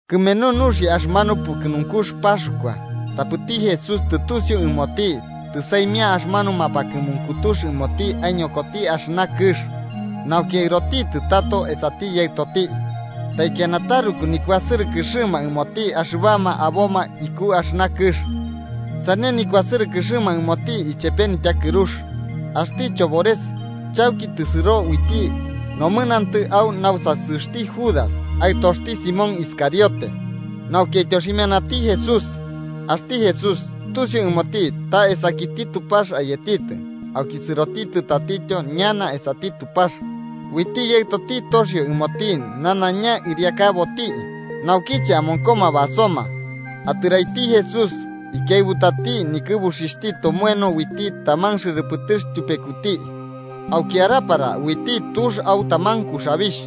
Kɨmenu nuxia axɨmanu pukɨnunkux Paxkua, tapɨti Jesús tɨtusiu ɨmoti tɨsaimia axɨmanu mapakɨmunkutux ɨmoti aiñokoti axɨna kɨx nauki aɨrotitɨ tato esati Yaɨtoti. Taikiana taruku nikuasɨrɨkɨxɨma ɨmoti axɨbama aboma iku axɨna kɨx, sane nikuasɨrɨkɨxɨma ɨmoti ichepe nityakɨrux. Axti chobores chauki tɨsɨro uiti nomɨnantɨ au nausasɨxti Judas aɨtoxti Simón Iscariote, nauki aityoximianati Jesús. Axti Jesús tusiu ɨmoti ta esakiti Tupax ayetitɨ, auki sɨrotitɨ tatityo ñana esati Tupax, uiti Yaɨtoti toxio ɨmoti nanaiña ɨriakaboti. Naukiche amonkoma basoma, atɨraiti Jesús ikiaɨbutati nikɨbuxixhti tomoeno uiti taman xɨrɨpɨtɨx tyupekuti. Auki araparati uiti tux au taman kuxabixh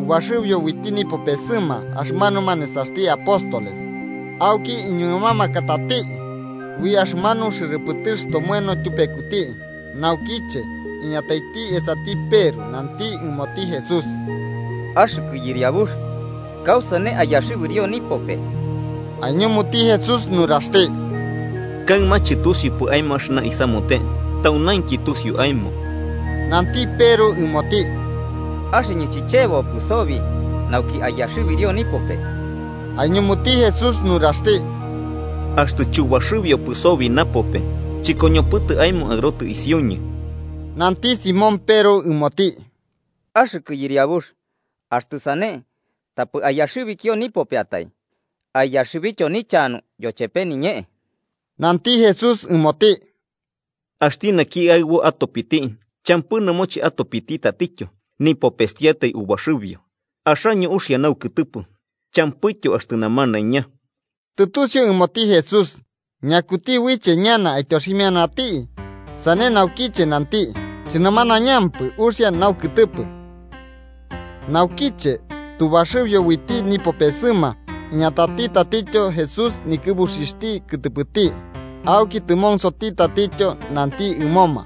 ubaxɨbio uiti nipopesɨma axɨmanuma nesaxti apóstoles auki iñuɨmamakati ui axɨmanu xɨrɨpɨtɨx tomoeno tyupekuti. Naukiche iñataiti esati Peru, nanti ɨmoti Jesús: –Axɨkɨ Yɨriabux, ¿kausane aiyaxɨbirio nipope? Aiñumuti Jesús nuraxti: –Kaɨma chɨtusiupɨ aemo axɨna isamute, taunainki tusiu aemo. Nanti Peru ɨmoti: –¡Axɨñɨ chichebopɨ sobi nauki aiyaxɨbirio nipope! Aiñumuti Jesús nuraxti: –Axtɨ chubaxɨbiopɨ sobi napope, chɨkoñopɨtɨ aemo aɨrotɨ isiuñɨ. Nanti Simón Peru ɨmoti: –¡Axɨkɨ Yɨriabux, axtɨ sane, tapɨ aiyaxɨbikio nipopeatai, aiyaxɨbityo nichanu yochepe niñee! Nanti Jesús ɨmoti: –Axti naki aɨbo atopiti, champɨ nɨmoche atopiti tatityo, nipopestiatai ubaxɨbio. Axaño uxia naukɨtɨpɨ, champɨityo axtɨ namanaiña. Tɨtusiu ɨmoti Jesús ñakuti uiche ñana aityoximianati, sane naukiche nanti “chɨnamanañampɨ uxia naukɨtɨpɨ”. Naukiche tubaxɨbio uiti nipopesɨma, iñatati tatityo Jesús nikɨbuxixhti kɨtɨpɨti auki tɨmonsoti tatityo nanti ɨmoma: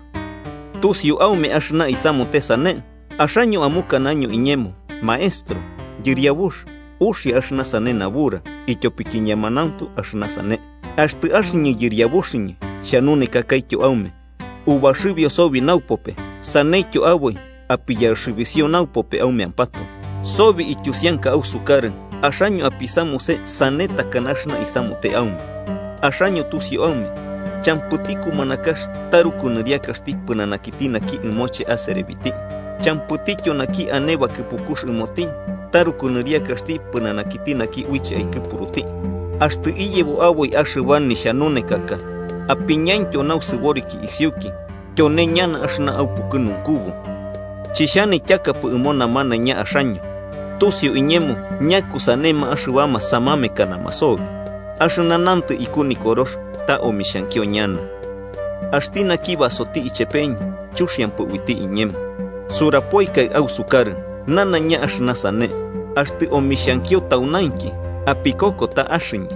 –¿Tusiu aume axɨna isamute sane? Axaño amukanaño iñemo Maestro Yɨriabux, uxia axɨna sane nabura, ityopiki ñemanuntu axɨna sane. Axtɨ axɨñɨ Yɨriabuxɨñɨ xhanunekakaityo aume, ubaxɨbio sobi naupope, saneityo aboi apiyaxɨbisio naupope aumeampatoe. Sobi ityusianka ausukarɨ, axaño apisamuse sane takana axɨna isamute aume. Axaño tusiu aume champɨti kumanakax taruku nɨriakaxti pɨnanakiti naki ɨmoche aserebiti, champɨtityo naki ane bakɨpukux ɨmoti taruku nɨriakaxti pɨnanakiti naki uiche aikɨpuruti. Axtɨ iyebo aboi axɨba nixhanunekaka apiñataityo nausɨboriki isiuki, tyone ñana axɨna aupukɨnunkubu. “Chixhanityakapɨ ɨmo namanaiña axaño. Tusiu iñemo ñakusanema axɨbama samamekanama sobi. Axɨna nantɨ iku Nikorox ta omixhankio ñana: ‘Axti naki basoti ichepeñɨ, chuxiampɨ uiti iñemo.’ Surapoikai ausukarɨ nanaiña axɨna sane, axtɨ omixhankio taunainki, apikoko ta Axɨñɨ.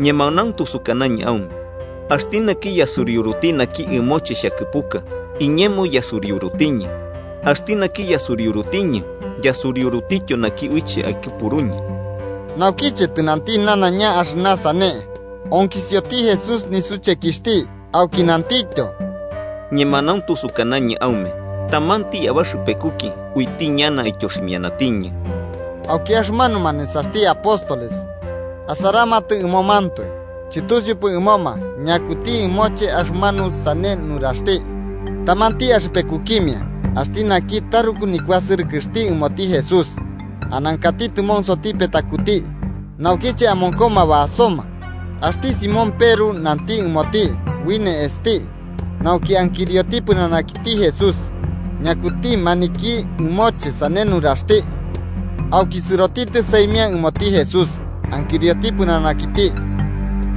Ñemanauntu sukanañɨ aume axti naki yasuriuruti naki ɨmoche xhakɨpuka, iñemo yasuriurutiñɨ. Axti naki yasuriurutiñɨ, yasuriurutityo naki uiche aikɨpuruñɨ.” Naukiche tɨnanti nanaiña axɨna sane, onkisioti Jesús nisuchekixhti, auki nantityo: –Ñemanauntu sukanañɨ aume tamanti abaxɨpekuki uiti ñana aityoximianatiñɨ. Auki axɨmanuma nesaxti apóstoles asaramatɨ ɨmomantoe, chɨtusiupɨ ɨmoma ñakuti ɨmoche axɨmanu sane nuraxti. Tamanti axɨpekukimia, axti naki taruku nikuasɨrɨkɨxti ɨmoti Jesús, anankati tɨmonsoti petakuti, naukiche amonkoma basoma, axti Simón Peru nanti ɨmoti ui ne'esti nauki ankirioti pɨnanakiti Jesús, ñakuti maniki ɨmoche sane nuraxti. Auki sɨrotitɨ saimia ɨmoti Jesús, ankirioti pɨnanakiti: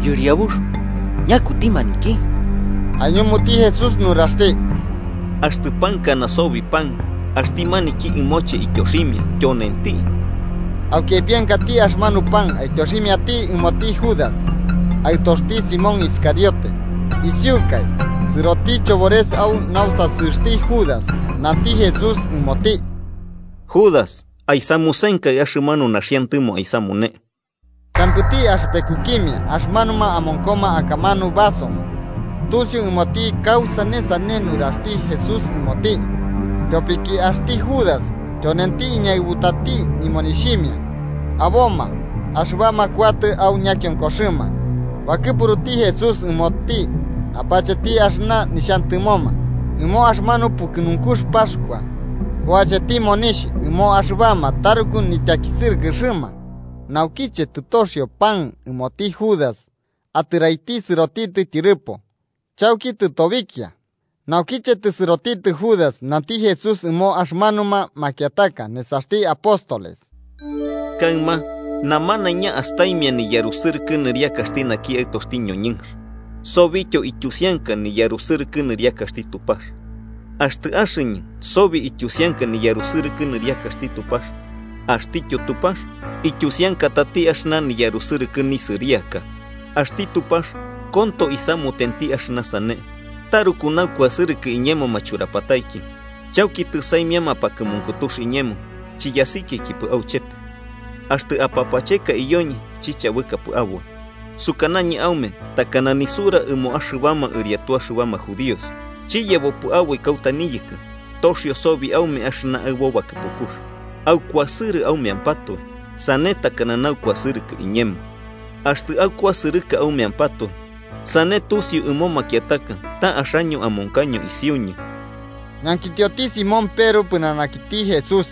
–Yɨriabux, ¿ñakuti maniki? Aiñumuti Jesús nuraxti: –Axtɨ pankana sobi pan, axti maniki ɨmoche ityoximia, tyonenti. Auki aipiankati axɨmanu pan aityoximiati ɨmoti Judas, aɨtoxti Simón Iscariote. Isiukai, sɨroti chobores au nausasɨxti Judas. Nanti Jesús ɨmoti: –Judas aisamusenkai axɨmanu naxiantɨmo aisamune. Champɨti axɨpekukimia axɨmanuma amonkoma akamanu basoma tusiu ɨmoti kausane sane nuraxti Jesús ɨmoti. Tyopiki axti Judas tyonenti iñaɨbutati nimonixhimia, aboma axɨbama kuatɨ au ñakionkoxɨma bakɨpuruti Jesús ɨmoti apacheti axɨna nixhantɨmoma ɨmo axɨmanu pukɨnunkux Paxkua, o acheti monixh ɨmo axɨbama taruku nityakisɨrɨkɨxɨma. Naukiche tɨtoxio pan ɨmoti Judas, atɨraiti sɨrotitɨ tyɨrɨpo. Chauki tɨtobikia. Naukiche tɨsɨrotitɨ Judas, nanti Jesús ɨmo axɨmanuma makiataka nesaxti apóstoles: –Kaɨma namanaiña astaimia niyarusɨrɨkɨ nisɨriakaxti naki Aɨtoxti ñoñɨnx. Sobityo ityusianka niyarusɨkɨ nɨriakaxti Tupax. Axtɨ axɨñɨ sobi ityusianka niyarusɨrɨkɨ nɨriakaxti Tupax, axtityo Tupax ityusiankatati axɨna niyarusɨrɨkɨ nisɨriaka. Axti Tupax konto isamutenti axɨna sane. Taruku naukuasɨrɨkɨ iñemo machurapataiki, chauki tɨsaimia mapakɨmunkutux iñemo chiyasikiaikipɨ auchepe. Axtɨ apapacheka iyoñɨ chichabɨkapɨ aboi, sukanañɨ aume takana nisura ɨmoma axɨbama ɨriatu axɨbama judíos: Chiyebopɨ aboi kauta niyɨkɨ. “Toxio sobi aume axɨna aɨbo bakɨpukux: Aukuasɨrɨ aumeampatoe. Sane takana naukuasɨrɨkɨ iñemo.” Axtɨ aukuasɨrɨka aumeampatoe, sane tusiu ɨmo makiataka ta axaño amonkaño isiuñɨ. Ñankitioti Simón Peru pɨnanakiti Jesús: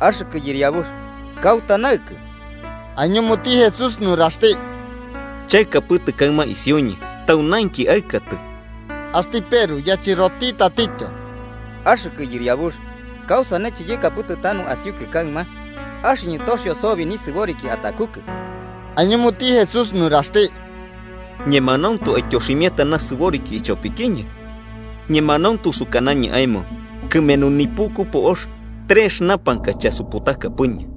–Axɨkɨ Yɨriabux, ¿kauta naɨkɨ? Aiñumuti Jesús nuraxti: –Chaɨkapɨtɨ kaɨma isiuñɨ. Taunainki aɨkatɨ. Axti Peru yachɨroti tatityo: –Axɨkɨ Yɨriabux, ¿kausane chiyɨkapɨtɨ tanu asiukɨ kaɨma? –¡Axɨñɨ toxio sobi nisɨboriki atakukɨ! Aiñumuti Jesús nuraxti. –¿Ñemanauntu aityoximiata nasɨboriki ichopikiñɨ? Ñemanauntu sukanañɨ aemo kɨmenu nipuku po'ox trex urapakai chasuputakapɨñɨ.